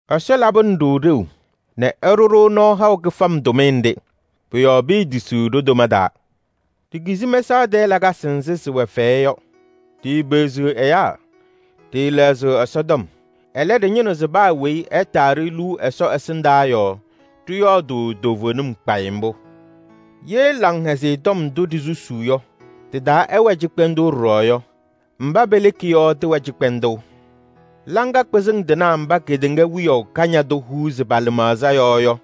Ɛsɔ labɩnɩ-ɖʋ ɖeu nɛ ɛɖʋ-ɖʋ nɔɔ haʋ kɩfam tʋmɩyɛ nɖɩ. Pʋ-yɔɔ piitisiɣ ɖo-toma taa. Ɖikizi mɛsaɣ tɛɛ lakasɩ nzɩ sɩwɛ fɛyɛ yɔ. Ɖiipeɣziɣ ɛyaa, ɖɩɩlɛɣzɩɣ Ɛsɔtɔm. Ɛlɛ, ɖɩñɩnɩɣ se paa weyi ɛtaa-ɖʋ liu Ɛsɔ ɛsɩndaa yɔɔ ɖɩyɔɔdʋʋ toovenim kpayɩ mbʋ. Ye Laŋhɛzɩyɛ Tɔm ndʋ ɖisusuu yɔ tɩ-taa ɛwɛ cɩkpɛndʋʋ ɖɔɖɔ yɔ, mba peleki yɔ tɩwɛ cɩkpɛndʋʋ. Laŋa kpɩzɩŋ tɩnaa mba kedeŋa wiyaʋ kañadʋ huuzi pa-lɩmaɣza yɔɔ yɔ,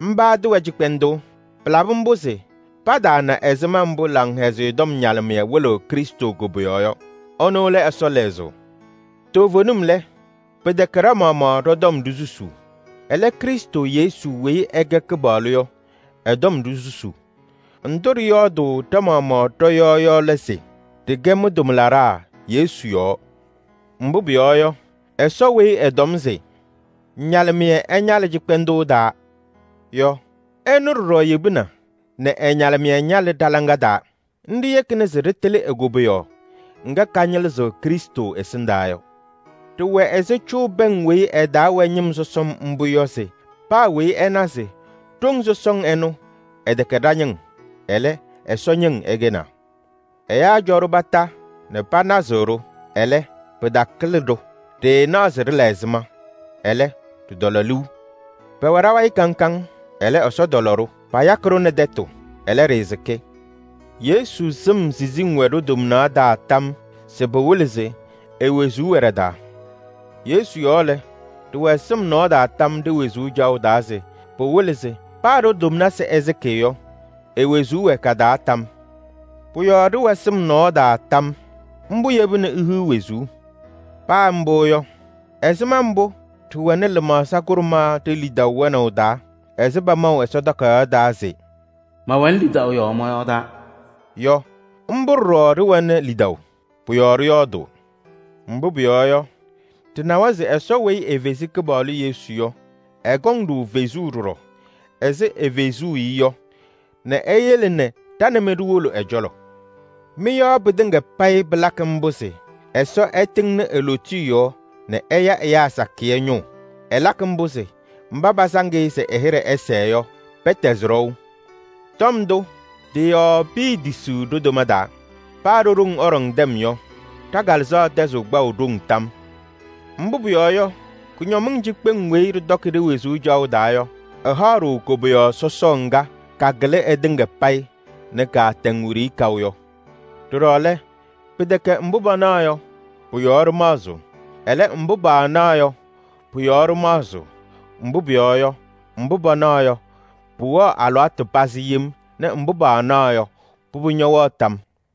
mba tɩwɛ cɩkpɛndʋʋ. Pɩlabɩ mbʋ se pataana ɛzɩma mbʋ Laŋhɛzɩyɛ Tɔm ñalɩmɩyɛ wɩlɩɣ Krɩstʋ koboyaɣ yɔ. Ɛnʋ lɛ Ɛsɔ lɛzʋʋ. Toovenim lɛ, pɩtɛkɛ ɖa-maɣmaɣ ɖɔ-tɔm ɖisusuu. Ɛlɛ, Krɩstʋ Yesu weyi ɛkɛ Kɩpaɣlʋ yɔ ɛ-tɔm ɖisusuu. Ndʋ ɖɩyɔɔdʋʋ ɖa-maɣmaɣ ɖɔ-yɔɔ yɔ lɛ se: ɖɩkɛ mɩ-tʋmlaɖaa Yesu yɔɔ. Mbʋ pʋyɔɔ yɔ, Ɛsɔ weyi ɛtɔm se: “Ñalɩmɩyɛ ɛñalɩ cɩkpɛndʋʋ taa” yɔ, ɛnʋ ɖɔɖɔ yebina nɛ ɛ-ñalɩmɩyɛ ñalɩ ɖa-laŋa taa. Nɖɩ yekina se ɖɩtɩlɩ e-koboyaɣ ŋga kañɩlɩzɩɣ Krɩstʋ ɛsɩndaa yɔ. Ɖɩwɛ ɛzɩ cʋʋ pɛŋ weyi ɩ-taa wɛ ñɩm sɔsɔm mbʋ yɔ se paa weyi ɛna se ɖoŋ sɔsɔŋ ɛnʋ ɛtɛkɛ ɖa-ñɩŋ, ɛlɛ Ɛsɔ ñɩŋ ɛkɛnaa. Ɛyaa cɔ-ɖʋ kondiko nɛ panazɩɣ-ɖʋ, ɛlɛ, pɩtakɩlɩ-ɖʋ. Ɖɩɩnaɣ se ɖɩla ɛzɩma, ɛlɛ, ɖɩtɔlɔ liu. Pɛwɛ ɖa-wayɩ kaŋ kaŋ, ɛlɛ, Ɛsɔ tɔlɔ-ɖʋ. Payakɩ-ɖʋ nɛ tɛtʋ, ɛlɛ, ɖɩɩsɩkɩ. Yesu sɩm siziŋ wɛ ɖo-tomnaɣ taa tam se pɩwɩlɩ se e-wezuu wɛ ɖa-taa. Yesu yɔɔ lɛ, ɖɩwɛ sɩm nɔɔ taa tam ɖe-wezuu caɣʋ taa se pɩwɩlɩ se paa ɖo-tomnaɣ ɛsɩkɩ yɔ, e-wezuu wɛ ka-taa tam. Pʋ-yɔɔ ɖɩwɛ sɩm nɔɔ taa tam. Mbʋ yebini ihiɣ wezuu. Paa mbʋ yɔ, ɛzɩma mbʋ ɖɩwɛnɩ lɩmaɣza kʋɖʋma ɖe-lidaʋ wɛnaʋ taa ɛzɩ pamaʋ Ɛsɔtɔm Takayaɣ taa se: “Mɛwɛnɩ lidaʋ yɔɔ mɔyɔɔdaa” yɔ, mbʋ ɖɔɖɔ ɖɩwɛnɩ lidaʋ. Pʋ-yɔɔ ɖɩyɔɔdʋʋ. Mbʋ pʋyɔɔ yɔ, ɖɩnawa se Ɛsɔ weyi efezi Kɩpaɣlʋ Yesu yɔ, ɛkɔŋ-ɖʋ fezuu ɖɔɖɔ ɛzɩ efezuu-i yɔ nɛ eyele ɖa nɛ mɩ ɖiwolo ɛ-cɔlɔ. Mɩ-yɔɔ pɩtɩŋa payɩ pɩlakɩ mbʋ se Ɛsɔ ɛtɩŋnɩ e-lootiye yɔɔ nɛ ɛya ɛyaa sakɩyɛ ñʋʋ. Ɛlakɩ mbʋ se mba pasaŋ-ɩ se ɛ-hɩɖɛ sɛɛ yɔ, pɛtɛzɩ ɖɔʋ. Tɔm ndʋ tɩ-yɔɔ piitisiɣ ɖo-toma taa. Paa ɖo-ɖoŋ ɛɖɔŋ tɛm yɔ, ɖa-kalɩzaɣ tɛzɩɣ kpaʋ ɖoŋ tam. Mbʋ pʋyɔɔ yɔ, kʋñɔmɩŋ cikpeŋ weyi ɖɩtɔkɩ ɖe-wezuu caɣʋ taa yɔ, ɩhaɣ-ɖʋ koboyaɣ sɔsɔɔ ŋga kakɩlɩ ɩtɩŋa payɩ nɛ kaatɛŋ wiɖiyi kaʋ yɔ. Ɖɔɖɔ lɛ, pɩtɛkɛ mbʋ panaɣ yɔ, pʋ-yɔɔ ɖɩmaɣzɩɣ. Ɛlɛ, mbʋ paanaɣ yɔ, pʋ-yɔɔ ɖɩmaɣzɩɣ. Mbʋ pʋyɔɔ yɔ, mbʋ panaɣ yɔ, pɩwɛɣ alɩwaatʋ pazɩ yem nɛ mbʋ paanaɣ yɔ, pʋbʋ ñɛwɛɣ tam.